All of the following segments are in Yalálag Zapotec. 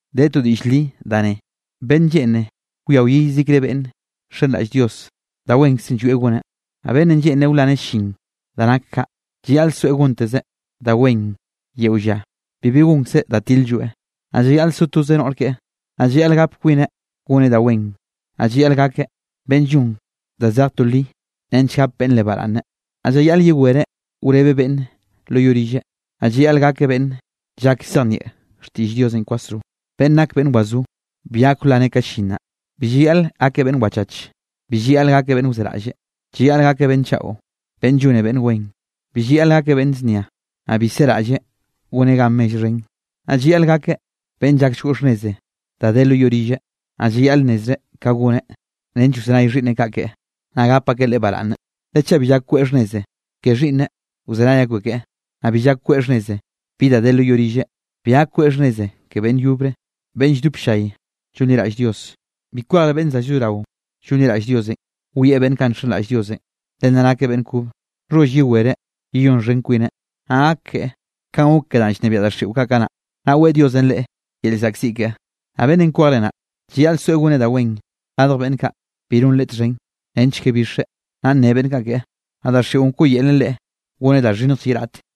De to diꞌll li da ne: Beꞌnn lleꞌne wia wyi yezikre beꞌnn nxenraꞌll Dios, da wenkzenꞌ llwieꞌ goneꞌ. Naꞌ beꞌnnenꞌ lleꞌnreꞌ wlaneꞌ goneꞌ llin danꞌ nak kaꞌ, llayaꞌleꞌ soeꞌ gontezeꞌ da wen yeo lla bibi gonkzeꞌ da til-lloeꞌ. Naꞌ llayaꞌl so toze noꞌr keꞌe, naꞌ llayaꞌl gakeꞌ beꞌnn yoꞌ xhbab, naꞌ llayaꞌl gapeꞌ kwineꞌ goneꞌ da wen, naꞌ llayaꞌl gakeꞌ beꞌnn llon da zej to li nench gap beꞌnne leꞌe baraꞌnne. Naꞌ llayaꞌl yewereꞌ wrebeꞌ beꞌnne lo yoꞌ rilleꞌ, naꞌ llayaꞌl gakeꞌ beꞌnn llak llzejnieꞌ xtiꞌll Diosenꞌ kwasro. Beꞌnn nake beꞌnn wazó bi gak wlaneꞌ ka llin naꞌ. Bi llayaꞌl gakeꞌ beꞌnn wachach. Bi llayaꞌl gakeꞌ beꞌnn wzeraꞌlle. Llayaꞌl gakeꞌ beꞌnn chaꞌo, beꞌnn llone beꞌnne wen, bi llayaꞌl gakeꞌ beꞌnn znia, naꞌ bi seraꞌlleꞌ goneꞌ gan mell xhen. Naꞌ llayaꞌl gakeꞌ beꞌnn llak llgoꞌ xhnneze da de lo yoꞌ rilleꞌ, naꞌ llayaꞌl nnezreꞌ ka goneꞌ nench wzenay xhiꞌnneꞌ kaꞌ keꞌe, naꞌ gap akeꞌ leꞌe baraꞌnne. Le chaꞌ bi llak kweꞌe xhnneze ke xhiꞌnneꞌ wzenay akbeꞌ keꞌe, naꞌ bi llak kweꞌe xhnneze bi da de lo yoꞌ rilleꞌ, bi gak kweꞌ xhnneze ke beꞌnn yobre beꞌnn lldop ll-llay llonliraꞌll Dios. Bi kwejre beꞌnn za llzorao llonliraꞌll Diosenꞌ wieꞌ beꞌnn kaꞌ nxenraꞌll Diosenꞌ, le nna nakeꞌ beꞌnn kobe nxholl yewereꞌ yeyonxhen kwineꞌ, naꞌ gak keꞌe kanꞌ gok ke danꞌ llnebiaꞌ daxiꞌo kaꞌ kanaꞌ, naꞌ weꞌe Diosenꞌ leꞌe yel llzaꞌkziꞌ keꞌe. Naꞌ beꞌnnenꞌ kwejre naꞌ, llayaꞌl soeꞌ goneꞌ da wen radj beꞌnn kaꞌ bi non reꞌ txhen, nench ke bixeꞌ, naꞌ nne beꞌnn kaꞌ keꞌe, naꞌ daxiꞌon wkoꞌyelen leꞌe goneꞌ da xhinnjlle ye raꞌte.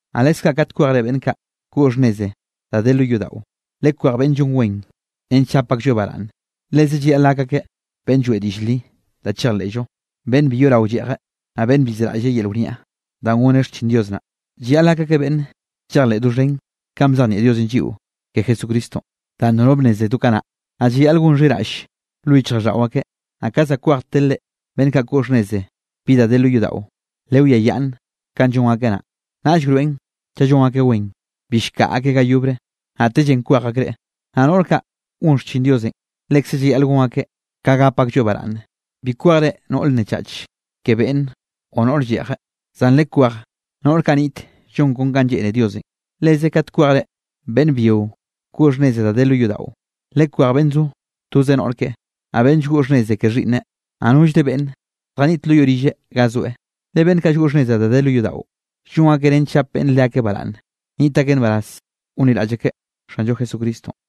Naꞌ leskaꞌ kat kwejre beꞌnn kaꞌ koꞌ xhnnez da de lo yodaꞌo, lekwej beꞌnn llon wen, nench gap aklloeꞌ baraꞌnne. Leze llayaꞌl gak akeꞌ beꞌnn lloeꞌ diꞌll li da chejleꞌllo, beꞌnn bi yoꞌrao lleꞌjeꞌ, naꞌ beꞌnn bi zeraꞌlleꞌ yel wniaꞌ danꞌ goneꞌ xchin Dios naꞌ. Llayaꞌl gak akeꞌ beꞌnn llejleꞌ doxhen kanꞌ bzejnieꞌ Diosenꞌ lliꞌo ke Jesucristonꞌ, danꞌ nono bnneze do kanaꞌ, naꞌ llayaꞌl gon xhiraꞌll lo yichjraꞌlldaꞌo akeꞌ. Naꞌ ka za kwejtere beꞌnn kaꞌ koꞌ xhnnez bi da de lo yodaꞌo, lewiayaꞌnne kanꞌ llon akeꞌ naꞌ, naꞌll wroeꞌn chaꞌ llon akeꞌ wen, bi llkaꞌa akeꞌ ga yobre, naꞌtellenꞌ kwej akreꞌ. Naꞌ noꞌr kaꞌ gon xchin Diosenꞌ, lekze llayaꞌl gon akeꞌ ka gap aklloeꞌ baraꞌnne. Bi kwejre noꞌr nnechach ke beꞌnne o noꞌr lleꞌjeꞌ, zan lekwej noꞌr kaꞌ niꞌt llon kon ka lleꞌne Diosenꞌ. Leze kat kwejre beꞌnn byio koꞌ xhnneze da de lo yodaꞌo, lekwej beꞌnn zo toze noꞌr keꞌe, naꞌ beꞌnn llgoꞌ xhnneze ke xhiꞌnneꞌ, naꞌ nollre beꞌnn zjaniꞌt lo yoꞌ rilleꞌ ga zoeꞌ. Le beꞌnn kaꞌ llgoꞌ xhnneze da de lo yodaꞌo, llon akeꞌ nench llap beꞌnn leakeꞌ baraꞌnne, nniꞌt akeꞌ nbaraz gonliraꞌll akeꞌ Xanllo Jesucristonꞌ.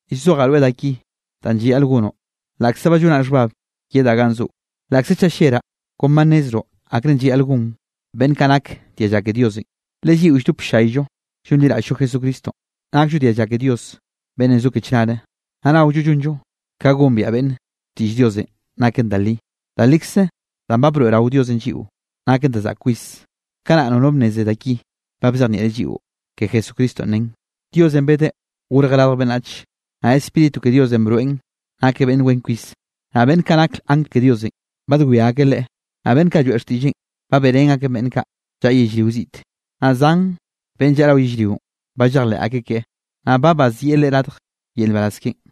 Llzojaꞌ rweꞌ da ki danꞌ llayaꞌl gonoꞌ laꞌkze ba llonaꞌ xhbab yedaꞌ ganꞌ zoꞌo. Laꞌkze chaꞌ lleraꞌ kon ba nnezroꞌ akrenꞌ llayaꞌl gon beꞌnn kaꞌ nake dialla Diosenꞌ, le lliꞌo lldop ll-llayllo llonliraꞌll-llo Jesucristonꞌ, nakllo dialla ke Dios beꞌnnenꞌ zo ke chnare, naꞌ naollo llonllo ka gombiaꞌ beꞌnn xtiꞌll Diosenꞌ naken da li. Da likze danꞌ ba broeꞌrao Diosenꞌ lliꞌo naken da zaꞌk kwis, kanaꞌ nono bnneze da ki ba bzejnieꞌreꞌ lliꞌo ke Jesucristonꞌ nen: Diosenꞌ bedeꞌ gorjeꞌ radj beꞌnnach, naꞌ Spíritu ke Diosenꞌ broeꞌn nakeꞌ beꞌnn wen kwis. Naꞌ beꞌnn kaꞌ nak angl ke Diosenꞌ, badwia akeꞌ Leꞌe. Naꞌ beꞌnn kaꞌ lloeꞌ xtiꞌlleꞌn, ba beꞌrén akeꞌn beꞌnn kaꞌ llaꞌa yellrio ziꞌte, naꞌ zan beꞌnn llaꞌa rao yellrionꞌ, ba llejleꞌ akeꞌ keꞌe. Naꞌ ba bazieꞌ Leꞌe radj yel nbaraz keꞌen.